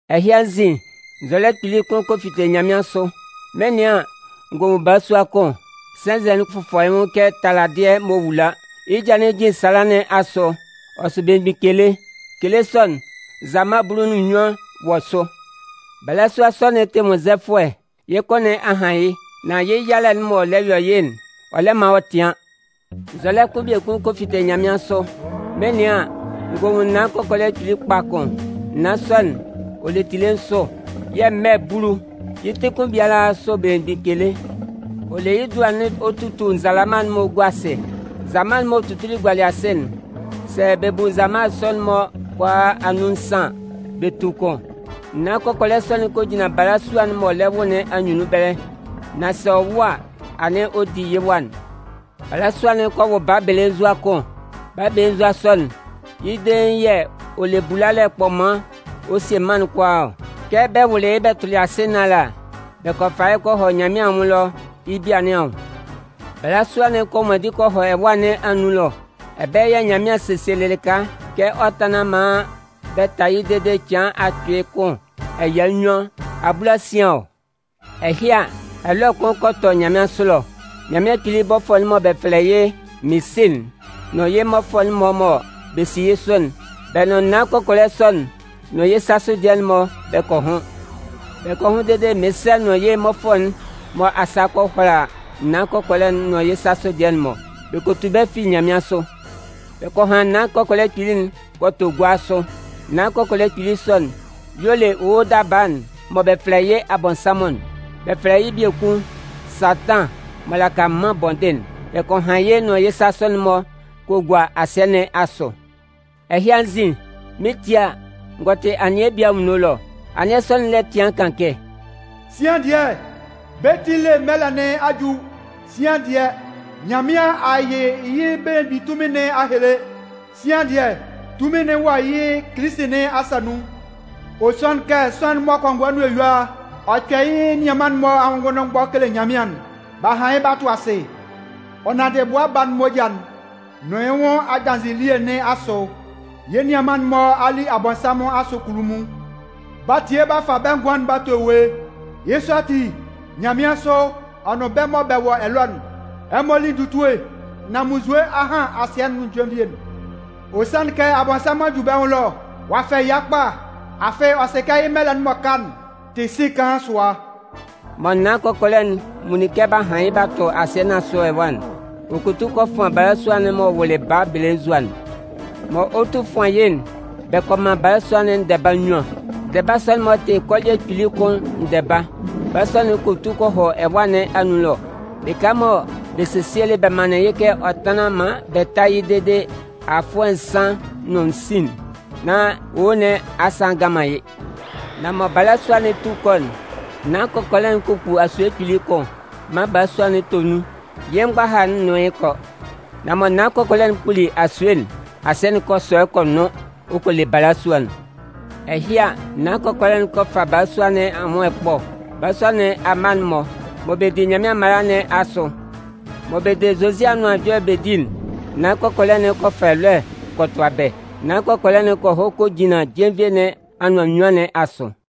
Ɛhɩ anzin, nzɔlɛ kpili kʋn kɔ fite nyanmɩansʋ. Mɩn 'nɩan an, n gɔ nwun balasua kʋn, sɛnzɛ'n fʋfɔ yɩ́ nwʋn kɛ taladɩɛ m'ɔ wula. Yɩ́ ja'n jijin sala nɩn asʋ. Ɔ sʋ belemgbin kele. Kele sɔ'n, Nzalama bulu nʋn nnyuan wɔ sʋ. Balasua sɔ'n tɩ nwʋnnzɛfʋɛ. Yɩ́ kʋ nɩn a han yɩ́, nán yɩ́ yalɛ'n mɔ ɔ lɛ yɔ yɩ́'n, ɔ lɛ man ɔ tɩan. Nzɔlɛ kʋn biekun kɔ fite nyanmɩansʋ. Mɩn 'nɩan an, n gɔ nwun naan kɔkɔlɛ kpili kpa kʋn. Naan sɔ'n, ɔ le tile nsʋ, yɛ̂ mmɛ bulu. Yɩ́ ti kʋn biala sʋ belemgbin kele. Ɔ le yɩ́ dua'n ɔ tutu nzalama'n-mɔ gua asɩ. Nzalama m'ɔ tutuli gualɩ asɩ'n, sɛ bɛ bu nzalama'n-mɔ kʋalaa anun nsan an, bɛ tu kʋn. Naan kɔkɔlɛ sɔ'n kɔ jinlan balasua'n m'ɔ lɛ wʋ nɩn anyunnun ɛbɛlɛ, nán sɛ ɔ wʋ a, anɩn ɔ 'di yɩ́ wa'n. Balasua'n kɔ wʋ baa belenzua kʋn. Baa belenzua sɔ'n, yɩ́ dein yɛ̂ ɔ le bulalɛ kpɔman ɔ 'sie mân'n kʋalaa ɔ. Kɛ bɛ wʋlɩ yɩ́ bɛ tʋlɩ asɩ nɩn ala, bɛ kɔ fa yɩ́ bɛ kɔ hɔ Nyanmɩan anwʋn ɛlɔ yɩ́ bia nɩn anwʋn. Balasua'n kɔ nwanndi kɔ hɔ ɛwâ nɩn anun ɛlɔ. Ɛbɛlɛ yɛ̂ Nyanmɩan sesielɩ lɩka kɛ ɔ tánlan maan bɛ tá yɩ́ dede cɩan akpɩɩ kʋn ɛya nnyuan abulasian ɔ. Ɛhɩ a, ɛlɔɛ kʋn kɔ tɔ nyanmɩansʋ ɛlɔ. Nyanmɩan Kpili bɔfʋɛ'n mɔ bɛ fɛlɛ yɩ́ Minsɛ'n nʋn yɩ́ mmɔfʋɛ'n-mɔ mɔ bɛ si yɩ́ sʋ'n, bɛ nʋn naan kɔkɔlɛ sɔ'n nʋn yɩ́ sasʋ dɩɛ'n-mɔ bɛ kɔ hʋn. Bɛ kɔ hʋn dede Minsɛ nʋn yɩ́ mmɔfʋɛ'n-mɔ asa kɔ hʋala naan kɔkɔlɛ'n nʋn yɩ́ sasʋ dɩɛ'n-mɔ. Bɛ kɔ tu bɛ́ fi nyanmɩansʋ. Bɛ kɔ han naan kɔkɔlɛ kpili'n kɔ tʋ gua sʋ. Naan kɔkɔlɛ kpili sɔ'n, y'ɔ le owo daba'n mɔ bɛ fɛlɛ yɩ́ Abɔnsanmʋn'n. Bɛ fɛlɛ yɩ́ biekun Satan m'ɔ laka mân bɔndɩn'n. Bɛ kɔ han yɩ́ ɔ nʋn yɩ́ sasʋ'n-mɔ bɛ kɔ gua asɩɛ nɩn asʋ. Ɛhɩ anzin, mɩn 'tie a, n gɔ tɩ anɩɛ bie anwunno ɛlɔ. Anɩɛ sɔ'n lɛ tɩan kan kɛ: “Sian dɩɛ, bɛ́ ti ele mɛlɛ nɩn a ju! Sian dɩɛ, Nyanmɩan a yɩ yɩ́ belemgbin tunmin nɩn a hele! Sɩan dɩɛ, tunmin'n wɔ yɩ́ Kilisi nɩn asa nun. Ɔ sanlɩn kɛ sʋanlan'n mɔ kɔngɔɛ nʋn eyua ɔ kpɛ yɛ́ nianman'n-mɔ anwʋn ngʋnndʋnmgbɔ kele Nyanmɩan'n, b'a han yɩ́ b'a tʋ asɩ. Ɔ nanndɩ Bʋa Baa'n moja'n nʋn yɩ́ nwʋn adanzɩɛ elie nɩn asʋ, yɛ́ nianman'n-mɔ a li Abɔnsanmʋn asʋ kunnunmun. B'a tie b'a fa bɛ́ ngʋan'n b'a to ewue. Yɩ́ sɔ ati, nyanmɩansʋ, ɛ nʋn bɛ́ mɔ bɛ wɔ ɛlɔ'n, ɛmɔ lí ndutue! Nan munnzue a han asɩɛ'n nʋn jenvie'n! Ɔ sanlɩn kɛ Abɔnsanmʋn a ju bɛ́ nwʋn ɛlɔ. Ɔ'a fɛ ɛya kpa, afɩ ɔ sɩ kɛ yɩ́ mɛlɛ'n m'ɔ ka'n tɩ sin kaan sʋa.” Mɔ naan kɔkɔlɛ'n nwunlin kɛ b'a han yɩ́ b'a tʋ asɩɛ nɩn asʋ ɛwa'n, ɔ kɔ tu kɔ fʋan balasua'n m'ɔ wʋlɩ baa belenzua'n. Mɔ ɔ 'tu fʋan yɩ́'n, bɛ kɔ man balasua'n ndɛba nnyuan. Ndɛba sɔ'n-mɔ tɩ kɔlɩɛ kpili kʋn ndɛba. Balasua'n kɔ tu kɔ hɔ ɛwâ nɩn anun ɛlɔ, lɩka mɔ bɛ sesielɩ bɛ manlɩn yɩ́ kɛ ɔ tánlan maan bɛ tá yɩ́ dede afʋɛ nsan nʋn sin'n, nán owo nɩn asa a ngan man yɩ́. Nan mɔ balasua'n 'tu kɔ'n, naan kɔkɔlɛ'n kɔ kpu asue kpili kʋn maan balasua'n tɔ nun yɩ́ mgbaha'n nʋn yɩ́ kɔ. Nan mɔ naan kɔkɔlɛ'n kpuli asue'n, asɩɛ'n kɔ sɔ kɔ nʋn ɔ kɔ le balasua'n. Ɛhɩ a, naan kɔkɔlɛ'n kɔ fa balasua nɩn anwʋn ɛkpɔ. Balasua nɩn amma'n-mɔ, mɔ bɛ di Nyanmɩan mala nɩn asʋ, mɔ bɛ de Zozi Anʋan Ɛjɔlɛ'n bɛ di'n, naan kɔkɔlɛ'n kɔ fa ɛlɔɛ kɔ tʋa bɛ́. Naan kɔkɔlɛ'n kɔ hɔ kɔ jinlan jenvie nɩn anʋan anyʋan nɩn asʋ.